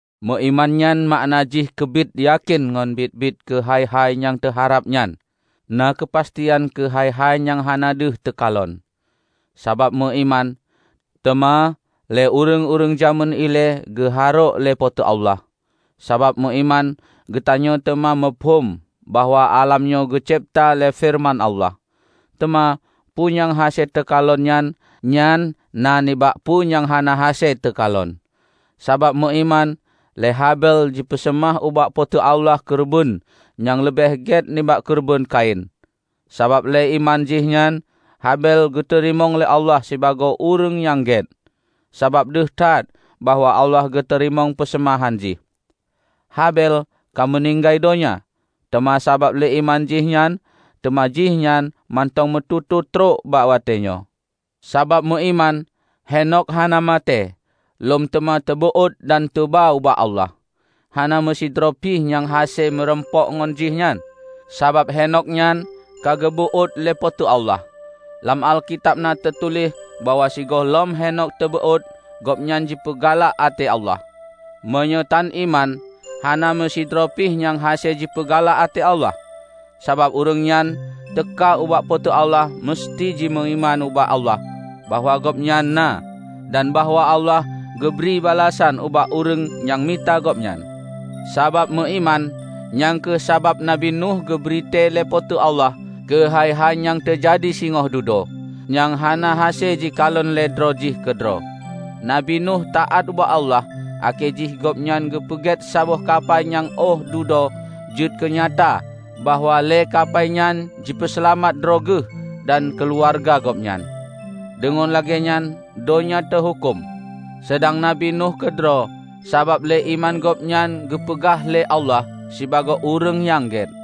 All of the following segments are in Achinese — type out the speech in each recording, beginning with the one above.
Meuiman nyan makna jih keubiet yakén ngon biet-biet keu hai-hai nyang teuharab nyan, na keupastian keu hai-hai nyang hana deuh teukalon. Sabab meuiman, teuma lé ureuëng-ureuëng jamén ilée geuharôk lé Po teu Allah. Sabab meuiman, geutanyoe teuma muphom bahwa álam nyoe geucebta lé feureuman Allah; teuma, peue nyang hase teukalon, nyan na nibak peue nyang hana hase teukalon. Sabab meuiman, lé Habel jipeuseumah ubak Po teu Allah keureubeuen nyang leubeh gét nibak keureubeuen Kain. Sabab lé iman jih nyan, Habel geuteurimong lé Allah sibagoe ureuëng nyang gét, sabab deuh that bahwa Allah geuteurimong peuseumahan jih. Habel ka meuninggai donya, teuma sabab lé iman jih nyan, teuma jih nyan mantong meututoe trok bak watée nyoe. Sabab meuiman, Henokh hana maté, lom teuma teubeuôt dan teuba ubak Allah. Hana meusidroe pi nyang hase meurumpok ngon jih nyan, sabab Henokh nyan ka geubeuôt lé Po teu Allah. Lam Alkitab na teutuléh bahwa sigohlom Henokh teubeuôt, gobnyan jipeugalak até Allah. Meunyoe tan iman, hana meusidroe pih nyang hase jipeugalak até Allah. Sabab ureuëng nyang teuka ubak Po teu Allah meuseuti jimeuiman ubak Allah bahwa Gobnyan na, dan bahwa Allah geubri balasan ubak ureuëng nyang mita Gobnyan. Sabab meuiman, nyang kheueh sabab Nabi Nuh geubri tée lé Po teu Allah keu hai-hai nyang teujadi singoh dudoe, nyang hana hase jikalon lé droe jih keudroe. Nabi Nuh taát ubak Allah akhé jih gobnyan geupeugét saboh kapai nyang óh dudoe jeuet keunyata bahwa lé kapai nyan jipeuseulamat droe geuh dan keuluwarga gobnyan. Deungon lagée nyan donya teuhuköm, seudang Nabi Nuh keudroe sabab lé iman gobnyan geupeugah lé Allah sibagoe ureuëng nyang gét.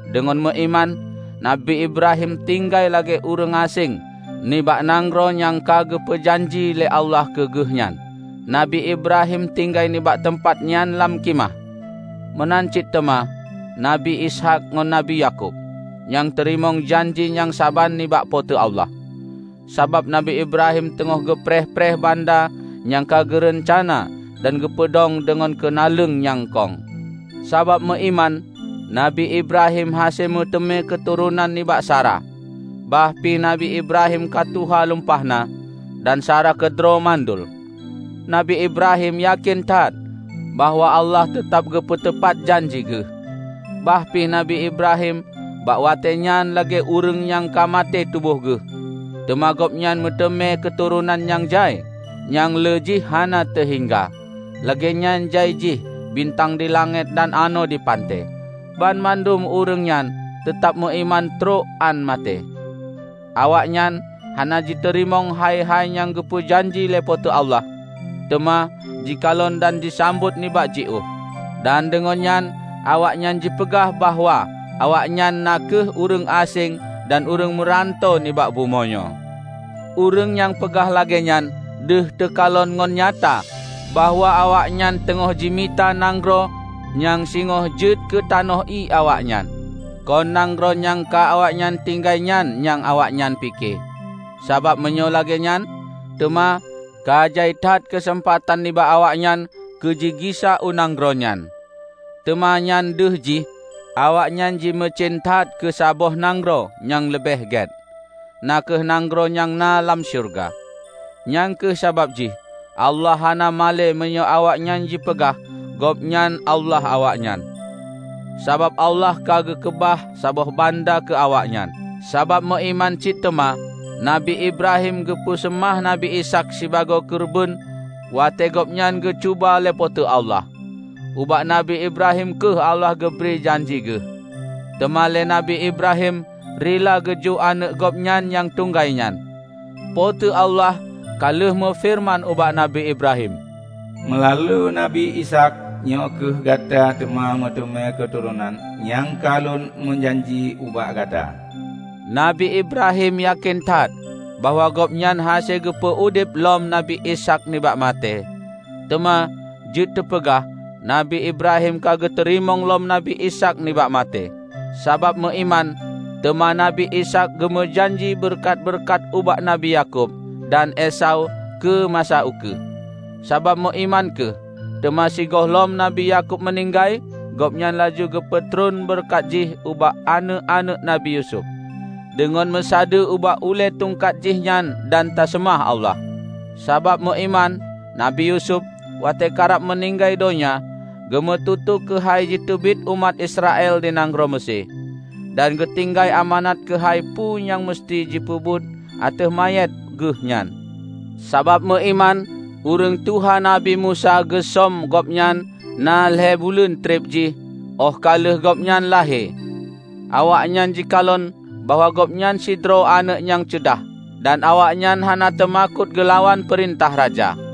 Deungon meuiman, Nabi Ibrahim tinggai lagée ureuëng aséng nibak nanggroe nyang ka geupeu janji lé Allah keu geuh nyan. Nabi Ibrahim tinggai nibak teumpat nyan lam khimah. Meunan cit teuma Nabi Ishaq ngon Nabi Yakub, nyang teurimong janji nyang saban nibak Po teu Allah. Sabab Nabi Ibrahim teungoh geupreh-preh banda nyang ka geureuncana dan geupeudong deungon keunaleueng nyang kong. Sabab meuiman, Nabi Ibrahim hase meuteumé keuturonan nibak Sara, bah pih Nabi Ibrahim ka tuha lumpah na, dan Sara keudroe mandul. Nabi Ibrahim yakén that bahwa Allah teutab geupeutupat janji Geuh. Bah pi Nabi Ibrahim bak watée nyan lagée ureuëng nyang ka maté tuboh geuh, teuma gobnyan meuteumé keuturonan nyang jai, nyang lé jih hana teuhingga -- lagée nyan jai jih bintang di langét dan anoe di panté. Banmandum ureuëng nyan teutab meuiman trok án maté. Awaknyan hana jiteurimong hai-hai nyang geupeu janji lé Po teu Allah, teuma jikalon dan jisambot nibak jiôh. Dan deungon nyan awaknyan jipeugah bahwa awaknyan na kheueh ureuëng aséng dan ureuëng meuranto nibak bumoe nyoe. Ureuëng nyang peugah lagée nyan deuh teukalon ngon nyata bahwa awaknyan teungoh jimita nanggroe nyang singoh jeuet keu tanoh ié awaknyan. Kon nanggroe nyang ka awaknyan tinggai nyan nyang awaknyan pike. Sabab meunyoe lagée nyan, teuma ka jai that keuseumpatan nibak awaknyan keujigisa u nanggroe nyan. Teuma nyan deuh jih, awaknyan jimeucen that keu saboh nanggroe nyang leubeh gét, na kheueh nanggroe nyang na lam syeuruga. Nyang kheueh sabab jih Allah hana malée meunyoe awaknyan jipeugah Gobnyan Allah awaknyan, sabab Allah ka geukeubah saboh banda keu awaknyan. Sabab meuiman cit teuma, Nabi Ibrahim geupeu seumah Nabi Ishaq sibagoe keureubeuen watée gobnyan geucuba lé Po teu Allah. Ubak nabi Ibrahim kheueh Allah geubri janji Geuh, teuma lé Nabi Ibrahim rila geujok aneuëk gobnyan nyang tunggai nyan. Po teu Allah ka lheueh meufeureuman ubak Nabi Ibrahim, "Meulalu Nabi Ishaq nyoe kheueh gata teuma meuteumé keuturonan nyang ka Lôn meujanji ubak gata." Nabi Ibrahim yakén that bahwa Gobnyan hase geupeu udeb lom Nabi Ishaq nibak maté -- teuma, jeuet teupeugah, Nabi Ibrahim ka geuteurimong lom Nabi Ishaq nibak maté. Sabab meuiman, teuma Nabi Ishaq geumeujanji beureukat-beureukat ubak Nabi Yakub dan Esau keu masa ukeue. Sabab meuiman kheueh, teuma sigohlom Nabi Yakub meuninggai, gobnyan laju geupeutron beureukat jih ubak aneuëk-aneuëk Nabi Yusuf -- deungon meusadeue ubak ulée tungkat jihnyan dan taseumah Allah. Sabab meuiman, Nabi Yusuf -- watée karab meuninggai donya -- geumeututoe keuhai jiteubiet umat Israel di nanggroe Meusé, dan geutinggai amanat keuhai peue nyang meuseuti jipeubuet ateueh manyét geuh nyan. Sabab meuiman, ureuëng tuha Nabi Musa geusöm gobnyan na lhée buleuen treb jih óh ka lheueh gobnyan lahé. Awaknyan jikalon bahwa gobnyan sidroe aneuëk nyang ceudah, dan awaknyan hana teumakot geulawan peurintah raja.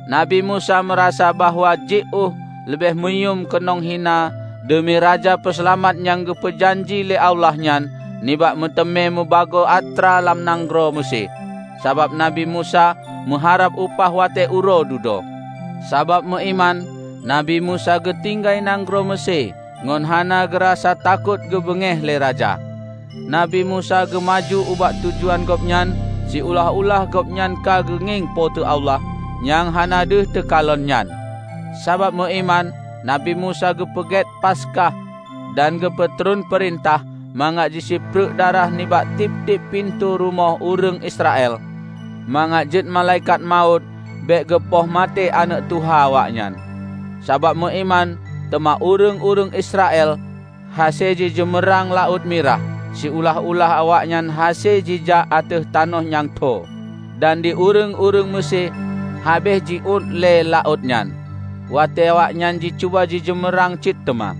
Nabi Musa meurasa bahwa jiôh leubeh muyuem keunong hina deumi Raja Peuseulamat nyang geupeu janji lé Allah nyan nibak meuteumé mubagoe atra lam nanggroe Meusé, sabab Nabi Musa meuharab upah watée uroe dudoe. Sabab meuiman, Nabi Musa geutinggai nanggroe Meusé ngon hana geurasa takot geubeungéh lé raja. Nabi Musa geumaju ubak tujuan gobnyan siulah-ulah gobnyan ka geungieng Po teu Allah nyang hana deuh teukalon nyan. Sabab meuiman, Nabi Musa geupeugét Paskah dan geupeutron peurintah mangat jisipreuk darah nibak tieb-tieb pintoe rumoh ureuëng Israel mangat jeuet Malaikat Mawöt bék geupoh maté aneuëk tuha awaknyan. Sabab meuiman, teuma ureuëng-ureuëng Israel hase jijeumeurang laôt Mirah, siulah-ulah awaknyan hase jijak ateueh tanoh nyang tho, dan di ureuëng-ureuëng Meusé habéh jiuét lé laôt nyan, watée awaknyan jicuba jijeumeurang cit teuma.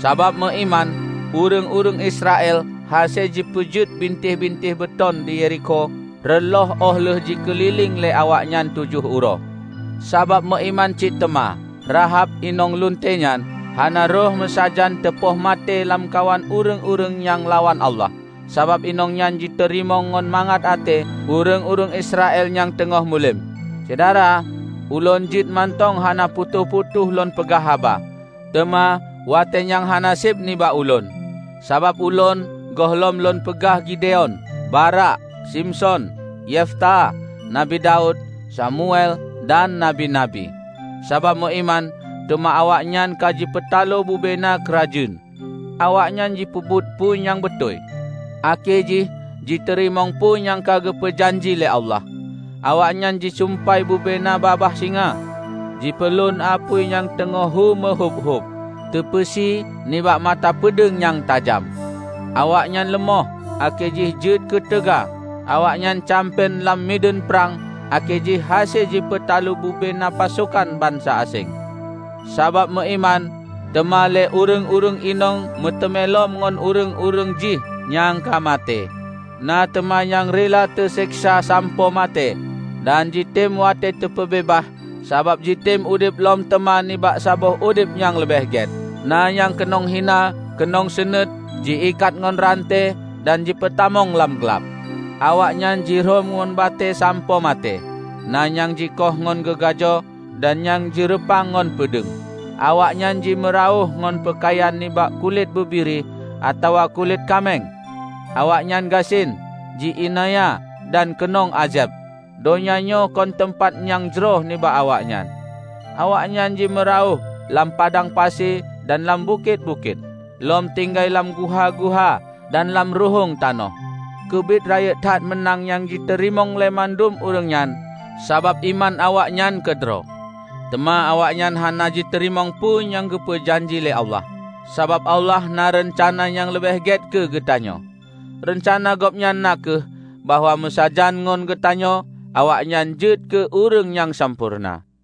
Sabab meuiman, ureuëng-ureuëng Israel hase jipeujeuet bintéh-bintéh beuton di Yerikho reuloh óh lheueh jikeulileng lé awaknyan tujoh uroe. Sabab meuiman cit teuma, Rahab, inong lunte nyan, hana rhoh meusajan teupoh maté lamkawan ureuëng-ureuëng nyang lawan Allah, sabab inong nyan jiteurimong ngon mangat até ureuëng-ureuëng Israel nyang teungoh muluem. Syedara, ulôn jeuet mantong hana putôh-putôh lôn peugah haba, teuma watée nyang hana seb nibak ulôn. Sabab ulôn gohlom lôn peugah Gideon, Barak, Simson, Yefta, Nabi Daud, Samuel, dan nabi-nabi. Sabab meuiman, teuma awaknyan ka jipeutalo bubena keurajeuen. Awaknyan jipeubuet peue nyang beutôi, akhé jih jiteurimong peue nyang ka geupeu janji lé Allah. Awaknyan jisumpai bubena babah singa, jipeulon apui nyang teungoh hu meuhúb-húb, teupeusi nibak mata peudeueng nyang tajam. Awaknyan leumoh, akhé jih jeuet keu teuga; awaknyan campen lam mideuen prang akhé jih hase jipeutalo bubena pasokan bansa aséng. Sabab meuiman, teuma lé ureuëng-ureuëng inong meuteumé lom ngon ureuëng-ureuëng jih nyang ka maté. Na teuma nyang rila teuseksa sampoe maté, dan jitem watée teupeubeubaih, sabab jitem udeb lom teuma nibak saboh udeb nyang leubeh gét. Na nyang keunong hina, keunong seunuét, ji-ikat ngon ranté dan jipeutamong lam glab. Awaknyan jirhom ngon batée sampoe maté, na nyang jikoh ngon gogajo, dan nyang jireupang ngon peudeueng. Awaknyan jimeurawöh ngon peukayan nibak kulét bubiri atawa kulét kaméng; awaknyan gasien, ji-iénanya dan keunong ázeb. Donya nyoe kon teumpat nyang jroh nibak awaknyan. Awaknyan jimeurawöh lam padang pasi dan lam bukét-bukét, lom tinggai lam guha-guha dan lam ruhueng tanoh. Keubiet rayeuk that meunang nyang jiteurimong lé mandum ureuëng nyan. Sabab iman awaknyan keudroe! Teuma awaknyan hana jiteurimong peue nyang geupeu janji lé Allah, sabab Allah na reuncana nyang leubeh gét keu geutanyoe. Reuncana Gobnyan na kheueh bahwa meusajan ngon geutanyoe, awaknyan jeuet keu ureuëng nyang sampoereuna.